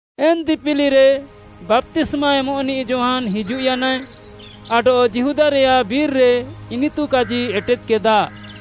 ଏନ୍‌ ଦିପିଲିରେ ବାପ୍ତିସ୍ମା ଏମଃନିଃ ଯୋହାନ୍‌ ହିଜୁଃୟାନାଏ, ଆଡଃ ଯିହୁଦାରେୟାଃ ବିର୍‌ରେ ଇନିତୁ କାଜି ଏଟେଦ୍‌କେଦା,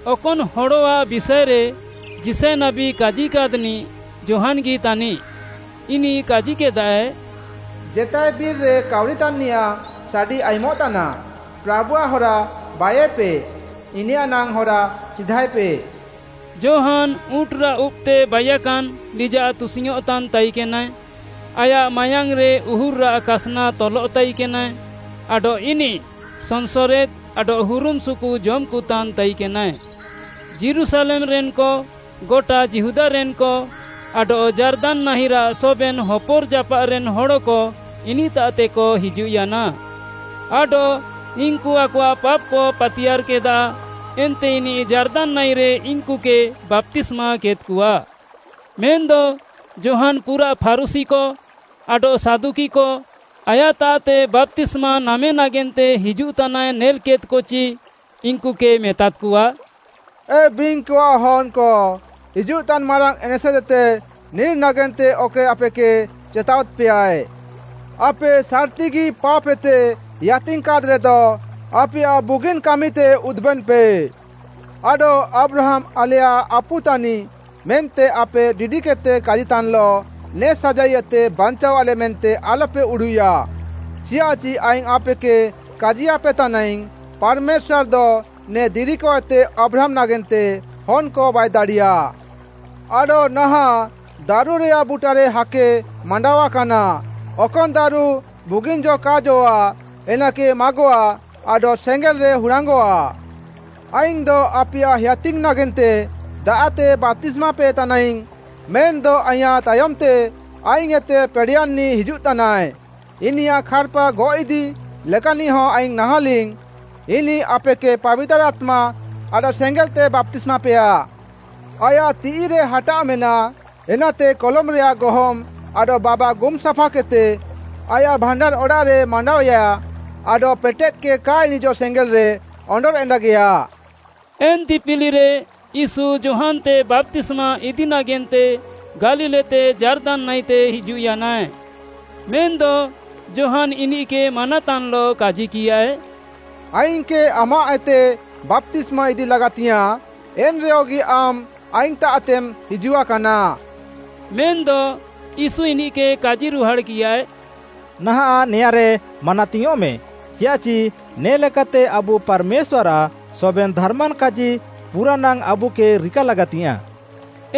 ଅକନ୍‌ ହଡ଼ଆଃ ବିଷାଏରେ ଯିଶାୟ ନାବୀ କାଜିକାଦ୍‌ନିଃ ଯୋହାନ୍‌ଗି ତାନିଃ: ଇନିଃ କାଜିକେଦାଏ, “ଜେତାଏ ବିର୍‌ରେ କାଉରିତାନ୍‌ନିୟାଃଁ ସାଡ଼ି ଆୟୁମଃତାନା, ‘ପ୍ରାଭୁଆଃ ହରା ବାଇୟେପେ; ଇନିୟାଃ ନାଙ୍ଗ୍‌ ହରା ସିଧାଏପେ।’” ଯୋହାନ୍‌ ଉଁଟ୍‌ରାଃ ଉବ୍‌ତେ ବାଇୟାକାନ୍ ଲିଜାଃ ତୁସିଙ୍ଗ୍‌ଅଃଁତାନ୍‌ ତାଇକେନାଏ, ଆୟାଃ ମାୟାଙ୍ଗ୍‌ରେ ଉହୁର୍‌ରାଃ କାସ୍‌ନା ତଲଃ ତାଇକେନାଏ ଆଡଃ ଇନିଃ ସନ୍‌ସରେଦ୍‌ ଆଡଃ ହୁରୁମ୍‌ସୁୁକୁ ଜମ୍‌କତାନ୍‌ ତାଇକେନାଏ। ଯୀରୁଶାଲେମ୍‌ରେନ୍‌କ, ଗଟା ଯିହୁଦାରେନ୍‌କ ଆଡଃ ଯାର୍ଦାନ୍‌ ନାହିଁରାଃ ସବେନ୍‌ ହପର୍‌ଜାପାଃରେନ୍‌ ହଡ଼କ ଇନିଃତାଃତେକ ହିଜୁଃୟାନା। ଆଡଃ ଇନ୍‌କୁ ଆକଆଃ ପାପ୍‌କ ପାତିୟାର୍‌କେଦା, ଏନ୍ତେ ଇନିଃ ଯାର୍ଦାନ୍‌ ନାହିଁରେ ଇନ୍‌କୁକେ ବାପ୍ତିସ୍ମାକେଦ୍‌କଆ। ମେନ୍‌ଦ ଯୋହାନ୍‌ ପୁରାଃ ଫାରୁଶୀକ ଆଡଃ ସାଦୁକିକ ଆୟାଃତାଃତେ ବାପ୍ତିସ୍ମା ନାମେ ନାଗେନ୍ତେ ହିଜୁଃତାନାଏ ନେଲ୍‌କେଦ୍‍କଚି ଇନ୍‌କୁକେ ମେତାଦ୍‌କଆ, “ଏ ବିଙ୍ଗ୍‌କଆଃ ହନ୍‌କ!” ହିଜୁଃତାନ୍‌ ମାରାଙ୍ଗ୍‌ ଏନେସେଦ୍‌ଏତେ ନିର୍‌ ନାଗେନ୍ତେ ଅକଏ ଆପେକେ ଚେତାୱାଦ୍‌ପେୟାଏ? ଆପେ ସାର୍‌ତିଗି ପାପ୍‌ଏତେ ହେୟାତିଙ୍ଗ୍‌କାଦ୍‌ରେଦ ଆପେୟାଃ ବୁଗିନ୍‌ କାମିତେ ଉଦୁବେନ୍‌ପେ। ଆଡଃ ଆବ୍ରାହାମ୍‌ ଆଲେୟାଃ ଆପୁ ତାନିଃ ମେନ୍ତେ ଆପେ ଡିଡିକେଦ୍‌ତେ କାଜିତାନ୍‌ଲଃ ନେ ସାଜାଇଏତେ ବାଞ୍ଚାୱାଃଲେ ମେନ୍ତେ ଆଲ୍‌ପେ ଉଡ଼ୁଃୟା। ଚିୟାଃଚି ଆଇଙ୍ଗ୍‌ ଆପେକେ କାଜିୟାପେ ତାନାଇଙ୍ଗ୍‌, ପାର୍‌ମେଶ୍ୱାର୍‌ଦ ନେ ଦିରିକଏତେ ଆବ୍ରାହାମ୍‌ ନାଗେନ୍ତେ ହନ୍‌କଏ ବାଇଦାଡ଼ିୟା! ଆଡଃ ନାହାଁଃ ଦାରୁରେୟାଃ ବୁଟାରେ ହାକେ ମାଣ୍ଡାୱା କାନା; ଅକନ୍‌ ଦାରୁ ବୁଗିନ୍‌ ଜ କା ଜଅଃ'ଆ ଏନାକେ ମାଗଃଆ ଆଡଃ ସେଙ୍ଗେଲ୍‌ରେ ହୁରାଙ୍ଗ୍‌ଅଃଆ। “ଆଇଙ୍ଗ୍‌ଦ ଆପେୟାଃ ହେୟାତିଙ୍ଗ୍‌ ନାଗେନ୍ତେ ଦାଆଃତେ ବାପ୍ତିସ୍ମାପେ ତାନାଇଙ୍ଗ୍‌ ମେନ୍‌ଦ ଆଇଁୟାଃ ତାୟମ୍‌ତେ ଆଇଙ୍ଗ୍‌ଏତେ ପେଡ଼େୟାନ୍‌ନିଃ ହିଜୁଃତାନାଏ; ଇନିୟାଃ ଖାର୍‌ପା ଗଅଃଇଦି ଲେକାନିଃହ ଆଇଙ୍ଗ୍‌ ନାହାଁଲିଙ୍ଗ୍‌। ଇନିଃ ଆପେକେ ପାବିତାର୍‌ ଆତ୍ମା ଆଡଃ ସେଙ୍ଗେଲ୍‌ତେ ବାପ୍ତିସ୍ମାପେୟା। ଆୟାଃ ତିଃଇରେ ହାଟାଆଃ ମେନାଃ, ଏନାତେ କଲମ୍‌ରେୟାଃ ଗହମ୍‌ ଆଡଃ ବାବା ଗୁମ୍ ସାଫାକେଦ୍‌ତେ ଆୟାଃ ଭାଣ୍ଡାର୍‌ ଅଡ଼ାଃରେ ମାଣ୍ଡାଅୟା ଆଡଃ ପେଟେଃକେ କା ଇଣିଁଜଃ ସେଙ୍ଗେଲ୍‌ରେ ଅଣ୍ଡର୍‌ଏଣ୍ଡାଗେୟା।” ଏନ୍‌ ଦିପିଲିରେ ୟୀଶୁ ଯୋହାନ୍‌ତେ ବାପ୍ତିସ୍ମା ଇଦି ନାଗେନ୍ତେ ଗାଲିଲ୍‌ଏତେ ଯାର୍ଦାନ୍‌ ନାହିଁତେ ହିଜୁଃୟାନାଏ। ମେନ୍‌ଦ ଯୋହାନ୍‌ ଇନିଃକେ ମାନାତାନ୍‌ଲଃ କାଜିକିୟାଏ, “ଆଇଙ୍ଗ୍‌କେ ଆମାଃଏତେ ବାପ୍ତିସ୍ମା ଇଦି ଲାଗାତିଙ୍ଗ୍‌ୟାଁଃ, ଏନ୍‌ରେହଗି ଆମ୍‌ ଆଇଙ୍ଗ୍‌ତାଃତେମ୍ ହିଜୁଆକାନା!” ମେନ୍‌ଦ ୟୀଶୁ ଇନିଃକେ କାଜିରୁହାଡ଼୍‌କିୟାଏ, “ନାହାଁଃ ନେଆଁଁରେ ମାନାତିଙ୍ଗ୍‌ୟଁଃମେ, ଚିୟାଃଚି ନେ ଲେକାତେ ଆବୁ ପାର୍‌ମେଶ୍ୱାର୍‌ଆଃ ସବେନ୍‌ ଧାର୍‌ମାନ୍‌ କାଜି ପୁରାନାଙ୍ଗ୍‌ ଆବୁକେ ରିକା ଲାଗାତିଙ୍ଗ୍‌ୟାଁଃ।”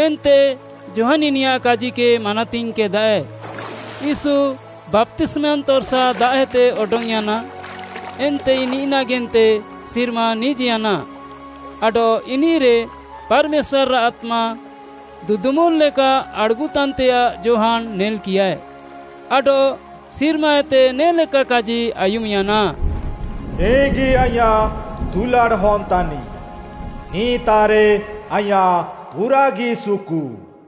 ଏନ୍ତେ ଯୋହାନ୍‌ ଇନିୟାଃ କାଜିକେ ମାନାତିଙ୍ଗ୍‌କେଦାଏ। ୟୀଶୁ ବାପ୍ତିସ୍ମାୟାନ୍‌ ତର୍‌ସା ଦାଆଃଏତେ ଅଡଙ୍ଗ୍‌ୟାନା। ଏନ୍ତେ ଇନିଃ ନାଗେନ୍ତେ ସିର୍ମା ନିଜ୍‌ୟାନା ଆଡଃ ଇନିଃରେ ପାର୍‌ମେଶ୍ୱାର୍‌ଆଃ ଆତ୍ମା ଦୁଦୁମୁଲ୍‌ ଲେକା ଆଡ଼୍‌ଗୁଃତାନ୍‌ତେୟାଃ ଯୋହାନ୍‌ ନେଲ୍‌କିୟାଏ। ଆଡଃ ସିର୍ମାଏତେ ନେ'ଲେକା କାଜି ଆୟୁମ୍‌ୟାନା, “ନିଃଗି ଆଇଁୟାଃ ଦୁଲାଡ଼୍‌ ହନ୍‌ ତାନିଃ, ନିଃତାଃରେ ଆଇଁୟାଃ ପୁରାଃଗି ସୁକୁ।”